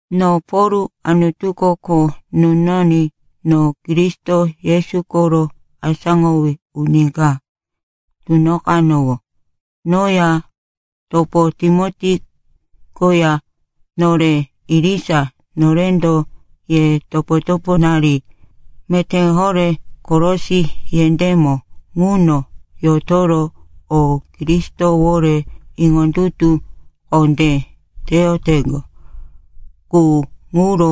No Pol, Anutuko kho nunoní no Kristo Yesu koro asáŋowí uni ka tunoqanowó. Noya topo Timoti koya, nore irisa norendo ye topo-toponari meté horé Kolosi yendémo ŋuno yotoro ko Kristowore iŋondutu kondé teyoteŋgo qu, ŋuro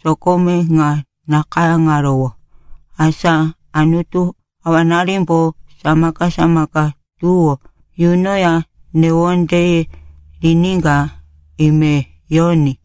sokome ŋa nakayáŋarowó. Asa Anutu Awananimbo samaka-samaka tuwó yunoya newondeye riníka ime yoní.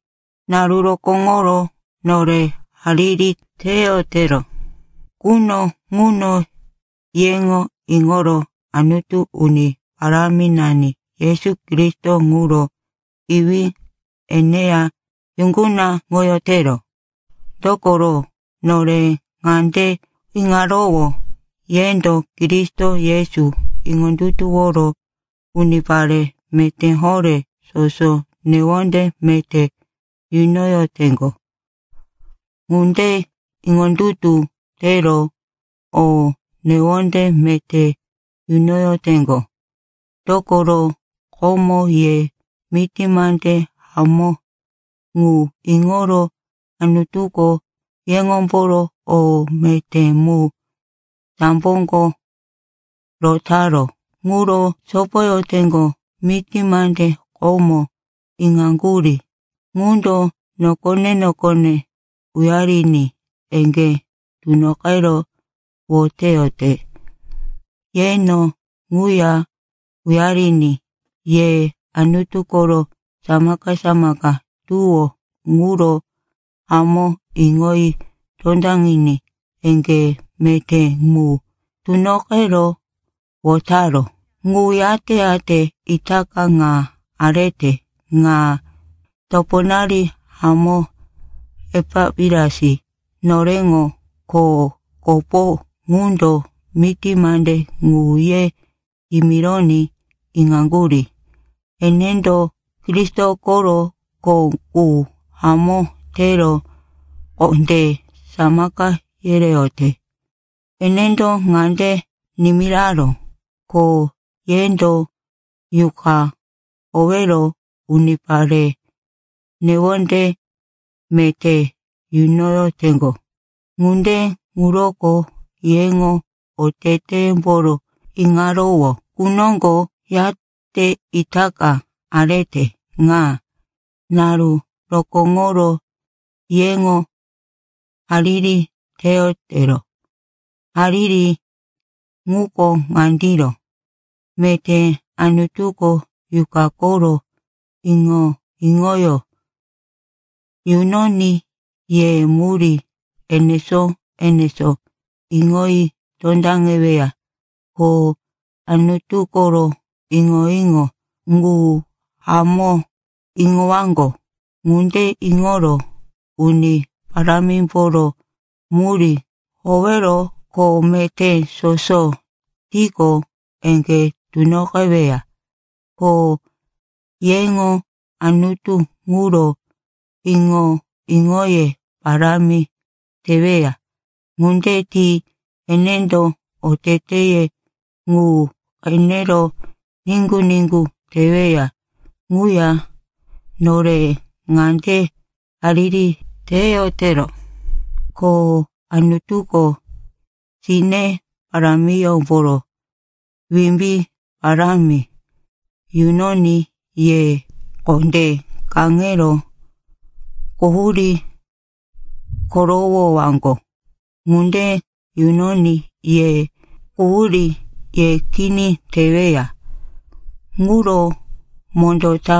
Naru rokóŋoro, nore hariri teyotero quno ŋuno, yeŋo iŋoro Anutu, Uni Paráminani Yesu Kristo ŋuro Iwí, eneya yuŋgunaŋoyotero. Dokoro, nore ŋande iŋarowó, yendo Kristo Yesu iŋondutuworo unipare meté horé soso newonde meté yunoyoteŋgo. Ŋunde iŋondutu tero o newonde meté yunoyoteŋgo, dokoro komo ye miti mande hamó ŋu iŋoro Anutuko yeŋomboro o meté mu samboko rotaró ŋuro sopoyoteŋgo. Miti mande komo iŋaŋgurí ŋundo nokone-nokone uyariní eŋgé tunoqero woteyote. Yeno ŋuya uyariní ye Anutu koro samaka-samaka tuwó ŋuro hamó iŋoyi tondaŋiní eŋgé meté mu tunoqero wotaró ŋu, yate-yate itaka ŋa arete ŋa. Toponari hamó Epapiras, noreŋo kho kopo ŋundo miti mande ŋu ye yimironí iŋaŋgurí. Enendo Kristo koro kho qu hamó tero kondé samaka yereyote. Enendo ŋande nimiraró, ko yendo Yuqa howero unipare newonde meté yunoyoteŋgo. Ŋunde ŋuroko yeŋo oteteyemboro iŋarowó qu noŋgo yate itaka arete ŋa, naru rokóŋoro yeŋo hariri teyotero. Hariri ŋuko ŋandiro, meté Anutuko Yuqa koro iŋo-iŋoyó yunoní ye murí enesó-enesó iŋoyi tondaŋeweya, ko Anutu koro iŋo-iŋo ŋu hamó iŋowaŋgo. Ŋunde iŋoro Uni Parámimboro murí howero kho meté soso tiqo, eŋgé tunoqeweya, ko yeŋo Anutu ŋuro iŋo-iŋoye parámi teweya. Ŋunde ti enendo oteteye ŋu qenero niŋgu-niŋgu teweya. Ŋuya nore ŋande hariri teyotero, ko Anutuko sine parámiyómboro wimbí parámi yunoní ye kondé kaŋero quhurí korowowaŋgo. Ŋunde yunoní ye quhurí ye kini teweya ŋuro mondó ta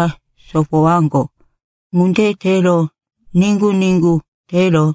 sopowaŋgo. Ŋunde tero niŋgu-niŋgu tero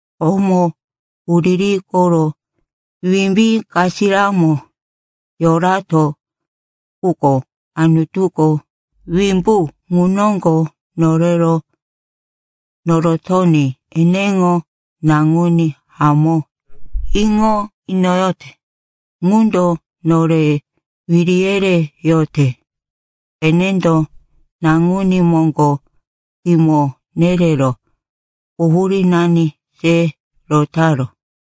Komo huriri koro wimbí kasiramo yorato, quko Anutuko wimbu ŋu noŋgo norero norotoní eneŋo Naŋuní hamó iŋo inoyote ŋundo nore wiri yereyote. Enendo Naŋuní moŋgo kimo nerero quhurínani se rotaró.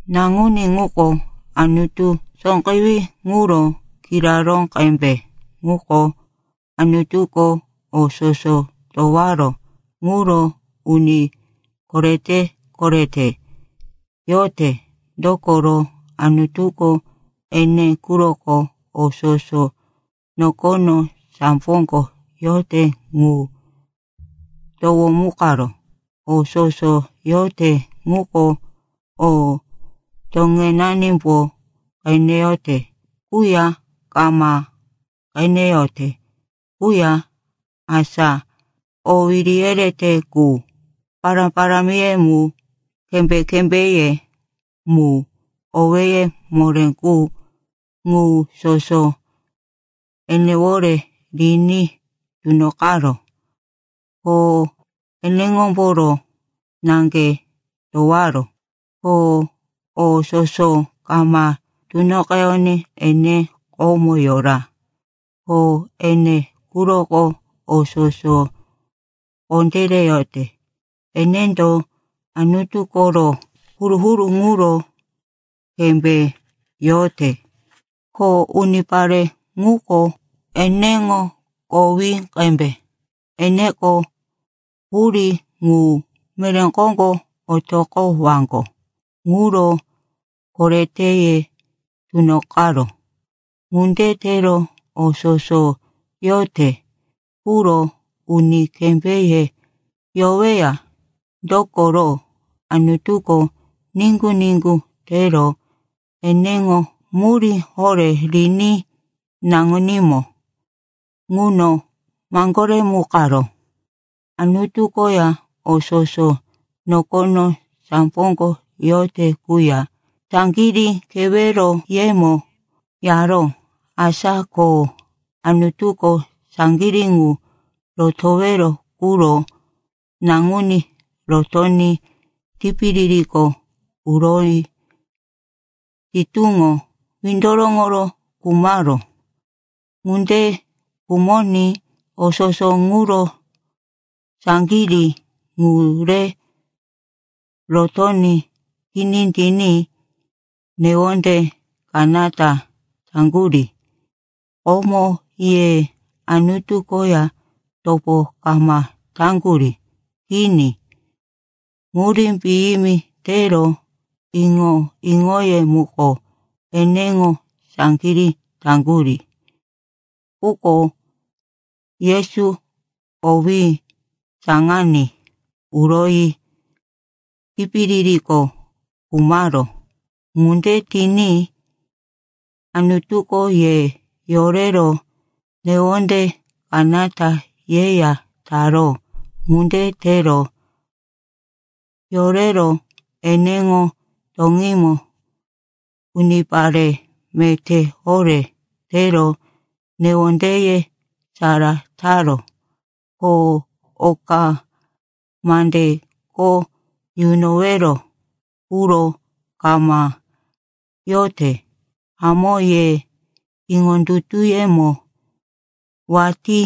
Naŋuní ŋuko Anutu sóqewí ŋuro kiraró qembe. Ŋuko Anutuko o soso towaró ŋuro uni korete-korete yote. Dokoro Anutuko ene quroko o soso nokono, samboko yote ŋu towomukaró. O soso yote ŋuko o toŋenanimbo qeneyote quya kama qeneyote quya, asa o wiri yerete qu, pará-parámiye mu, kembé-kembéye mu, owéye moré qu, ŋu soso enewore riní tunoqaró, ko eneŋomboro naŋge towaró. Ko o soso kama tunoqeyoní, ene komo yora. Ko ene quroko o soso kondéreyote. Enendo Anutu koro huru-huru ŋuro kembé yote, ko unipare ŋuko eneŋo kowí qembe. Eneko hurí ŋu, meré koŋgo otoqowaŋgo ŋuro koreteye tunoqaró. Ŋunde tero o soso yote quro uni kembéye yoweya. Dokoro Anutuko niŋgu-niŋgu tero eneŋo murí horé riní naŋunímo ŋuno maŋgoremukaró. Anutu koya o soso nokono, samboko yote quya saŋgirí keweroyemo yaró. Asa ko Anutuko saŋgirí ŋu rotowero quro naŋuní rotoní tipiririko uroyi sitúŋo windoroŋoro khumaró. Ŋunde khumoní o soso ŋuro saŋgirí ŋu re rotoní kini tiní newonde kanata taŋgurí. Komo ye Anutu koya topo kama taŋgurí. Kini, murí piyimi tero iŋo-iŋoye muko eneŋo saŋgirí taŋgurí. Quko Yesu kowí saŋaní uroyi tipiririko khumaró. Ŋunde tiní Anutuko ye yorero newonde kanata yeya taró. Ŋunde tero yorero eneŋo toŋímo unipare meté horé tero newondeye sara taró, ko oka mande kho yunowero quro kama yote. Hamó, ye iŋondutuyemo watí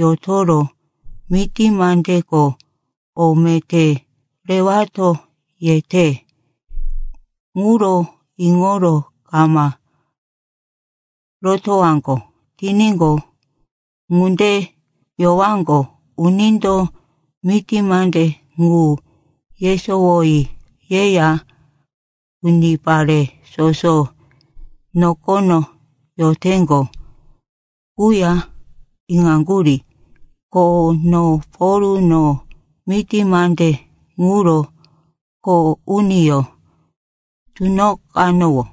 yotoro miti mandeko o meté rewato yete ŋuro iŋoro kama rotowaŋgo tiníqo, ŋunde yowaŋgo. Unindo miti mande ŋu yesowoyi yeya unipare soso nokono yoteŋgo quya iŋaŋgurí. Ko no Pol, no miti mande ŋuro kho uniyó tunoqanowó.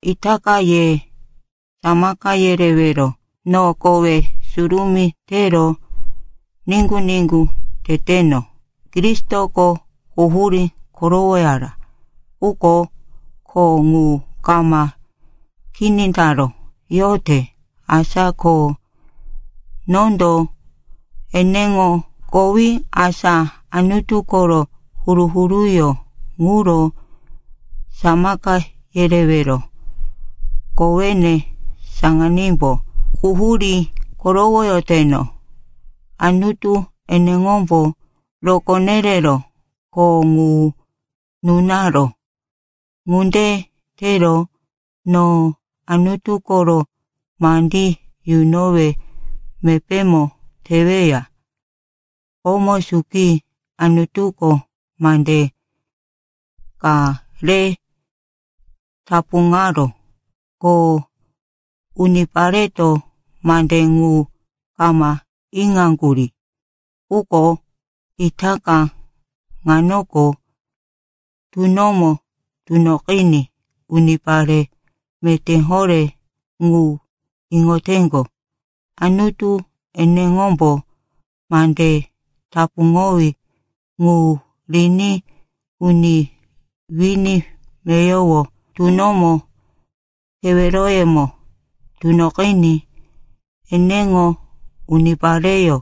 Itaka ye samaka yerewero no kowe surumí tero niŋgu-niŋgu teteno. Kristoko quhurí korowoyara. Quko kho ŋu kama kini taró, yote. Asa ko nondo eneŋo kowí, asa Anutu koro huru-huruyó ŋuro samaka yerewero kowene saŋanímbo quhurí korowoyoteno. Anutu eneŋombo rokó nerero kho ŋu nunaró. Ŋunde tero no Anutu koro mandí yunowe mepémo teweya. Komo suki Anutuko mande ka re tapuŋaró, ko unipareto mande ŋu kama iŋaŋgurí. Quko itaka ŋanoko tunomo tunoqiní unipare meté horé ŋu iŋoteŋgo. Anutu eneŋombo mande tapuŋowí ŋu riní uni wini meyowo tunomo keweroyemo tunoqiní eneŋo unipareyó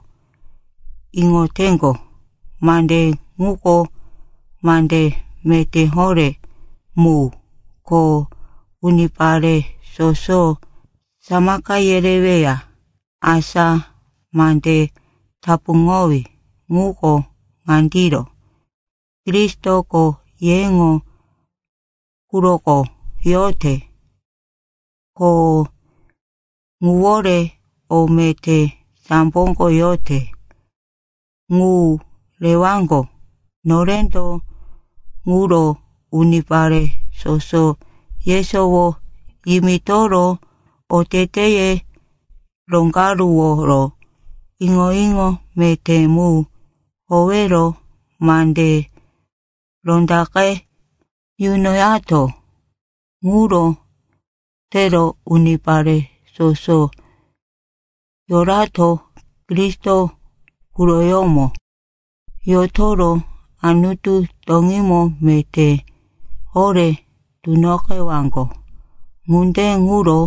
iŋoteŋgo. Mande ŋuko mande meté horé mu ko unipare soso samaka yereweya. Asa mande tapuŋowí ŋuko ŋandiro: Kristoko yeŋo quroko yote, ko ŋuwore o meté samboko yote ŋu rewaŋgo. Norendo ŋuro unipare soso yesowo yimitoro oteteye roŋgaruworo iŋo-iŋo meté mu howero mande rondaqe yunoyato. Ŋuro tero unipare soso yorato Kristo quroyómo yotoro Anutu toŋímo meté horé tunoqewaŋgo. Ŋunde ŋuro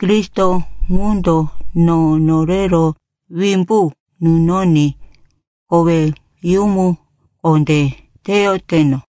Kristo ŋundo no norero wimbu nunoní koweyumu kondé teyoteno.